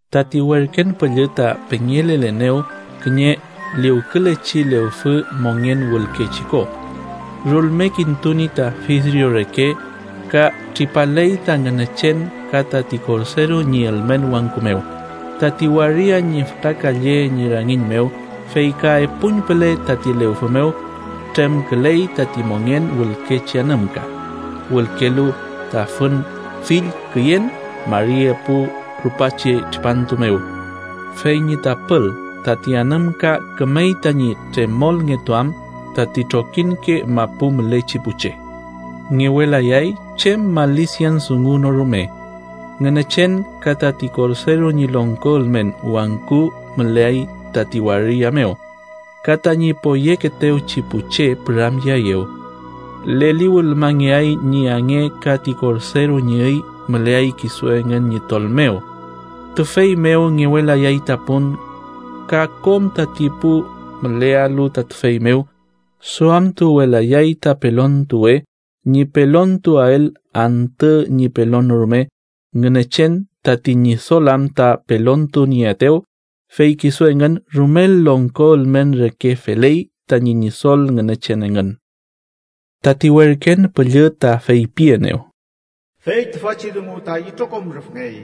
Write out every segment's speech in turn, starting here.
Tati werken püllü ta pengelelenew kiñe liwkülechi lewfü, mongen wülkechi ko. Rulmekintuni ta fidrio reke ka tripaley ta Ngünechen ka tati Korderu ñi ülmen wangku mew. Tati waria ñi fütra kalle ñi rangiñ mew, fey ka epuñpüle tati lewfü mew, tremküley tati mongen wülkechi anümka, wülkelu ta fün fill küyen, mari epu rupachi tripantu mew. Fey ñi tapül tati anümka kümey tañi tremolngetuam tati trokiñke mapu mülechi pu che. Ngewelayay chem malisian dungu no rume. Ngünechen ka tati Korderu ñi longko ülmen wangku müleay tati waria mew, ka tañi poyekeetewchi pu che püramyeaeyew. Leliwülmangeay ñi ange ka ti Korderu ñi üy müleay kisu engün ñi tol mew. Tüfey mew ngewelayay ta pun, ka kom tati pu mülealu ta tüfey mew duamtuwelayay ta pelontuwe ñi pelontuael, antü ñi pelon no rume, Ngünechen tati Ñidol am ta pelontunieaetew, fey kisu engün rumel longko ülmen reke feley tañi Ñidol Ngünechen engün. Tati werken püllü ta feypienew: “Fey tüfachi dungu ta itrokom rüfngey,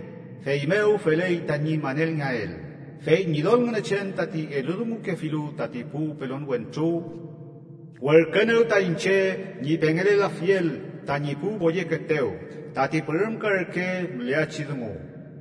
feymew feley tañi manelngeael. Fey Ñidol Ngünechen tati eludungukefilu tati pu pelon wentru, werküenew ta iñche ñi pengelelafiel tañi pu poyekeetew tati pürümka reke müleachi dungu.”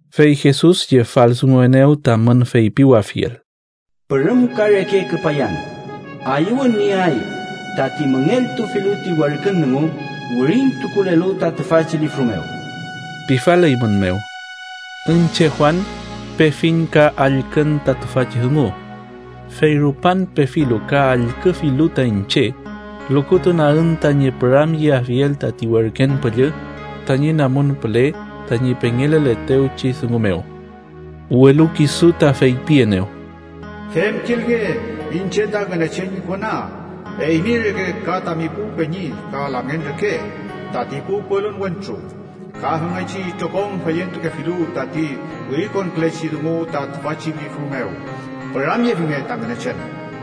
Fey Jesus yefaldunguenew tamün feypiwafiel: “¡Pürümka reke küpayan! ¡Ayüwün nieay tati müngeltufilu ti werkün dungu wirintukulelu ta tüfachi lifru mew!” pifaleymünmew. Iñche, Juan, pefiñ ka allkün ta tüfachi dungu. Fey rupan pefilu ka allküfilu ta iñche, lukutunagün tañi püramyeafiel tati werken püllü tañi namun püle tañi pengeleletewchi dungu mew. Welu kisu ta feypienew: “Femkilnge, iñche ta Ngünechen ñi kona, eymi reke ka tami pu peñi ka lamngen reke tati pu pelon wentru ka femngechi itrokom feyentukefilu tati wirikonkülechi dungu ta tüfachi lifru mew. Püramyefinge ta Ngünechen.”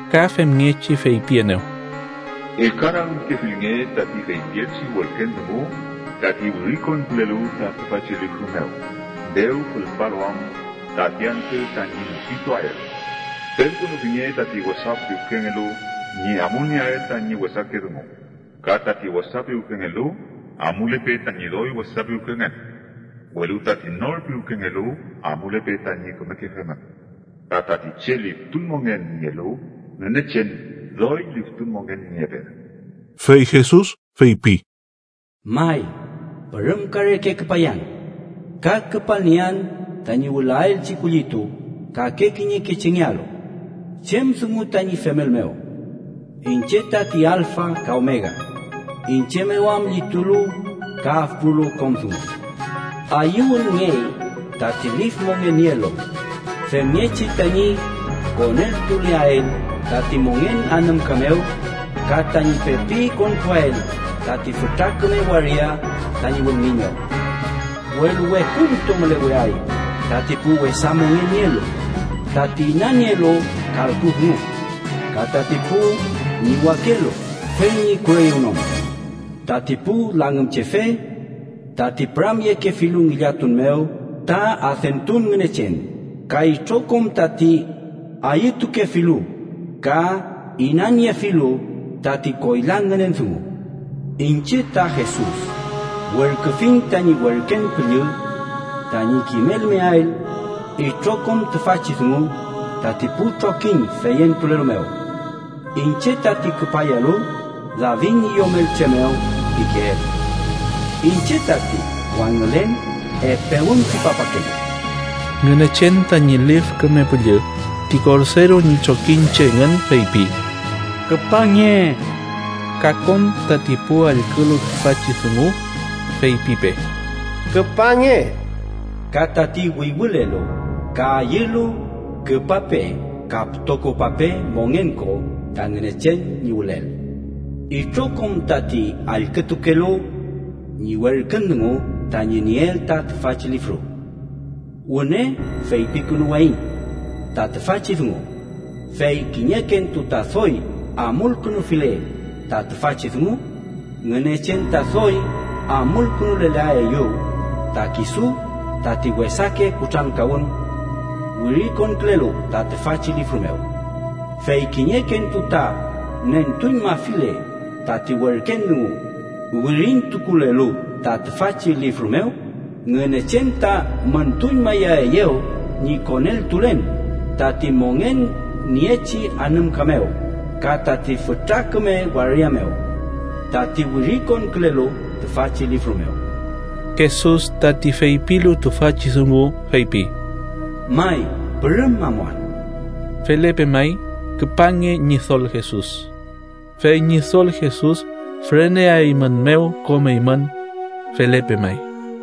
Ka femngechi feypienew: “Ellkanagümkefilnge tati feypielchi werken dungu tati wirikonkülelu ta tüfachi lifru mew, dew fülpalu am tati antü tañi mupituael. Femkünufinge tati wesa piwkengelu ñi amulnieael tañi wesake dungu, ka tati wesa piwkengelu amulepe tañi doy wesa piwkengen. Welu tati nor piwkengelu amulepe tañi kümeke femün, ka tati che liftun mongen nielu Ngünechen doy liftun mongen niepe.” Fey Jesus feypi: “May, pürümka reke küpayan, ka küpalniean tañi wülaelchi kullitu kake kiñeke chengealu chem dungu tañi femel mew. Iñche tati alfa ka omega, iñche mew am llitulu ka afpulu kom dungu. “Ayüwünngey tati lif mongen nielu femngechi tañi koneltuleael tati mongen anümka mew ka tañi pepi konpuael tati fütra küme waria tañi wülngiñ mew. Welu wekuntu müleweay tati pu wesa mongen nielu, tati inanielu kalku dungu, ka tati pu ñiwakelu fey ñi kureyewnon, tati pu langümchefe, tati püramyekefilu ngillatun mew ta adentun ngünechen ka itrokom tati ayütukefilu ka inaniefilu tati koyla ngünen dungu. “Iñche, ta Jesus, werküfiñ tañi werken püllü tañi kimelmeael itrokom tüfachi dungu tati pu trokiñ feyentulelu mew. Iñche tati küpayalu David ñi yomelche mew pikeel. Iñche tati wangülen epe wün tripapakelu.” Ngünechen tañi Lif Küme Püllü ti Korderu ñi trokiñche engün feypi: “¡Küpange!” Ka kom tati pu allkülu tüfachi dungu, feypipe: “¡Küpange!” Ka tati wüywülelu, ka ayülu, küpape ka pütokopape mongen ko, ta Ngünechen ñi wülel. Itrokom tati allkütukelu ñi werkün dungu tañi nieel ta tüfachi lifru, wüne feypikünuwayiñ ta tüfachi dungu: Fey kiñekentu ta doy amulkünufile ta tüfachi dungu, Ngünechen ta doy amulkünulelaeyew ta kisu tati wesake kutrankawün wirikonkülelu ta tüfachi lifru mew. Fey kiñekentu ta nentuñmafile tati werken dungu wirintukulelu ta tüfachi lifru mew, Ngünechen ta müntuñmayaeyew ñi koneltulen tati mongen niechi anümka mew ka tati fütra küme waria mew, tati wirikonkülelu tüfachi lifru mew. Jesus, tati feypilu tüfachi dungu, feypi: “May, pürüm amuan.” Felepe may. ¡Küpange, Ñidol Jesus! Fey Ñidol Jesus füreneaeymünmew kom eymün. Felepe may.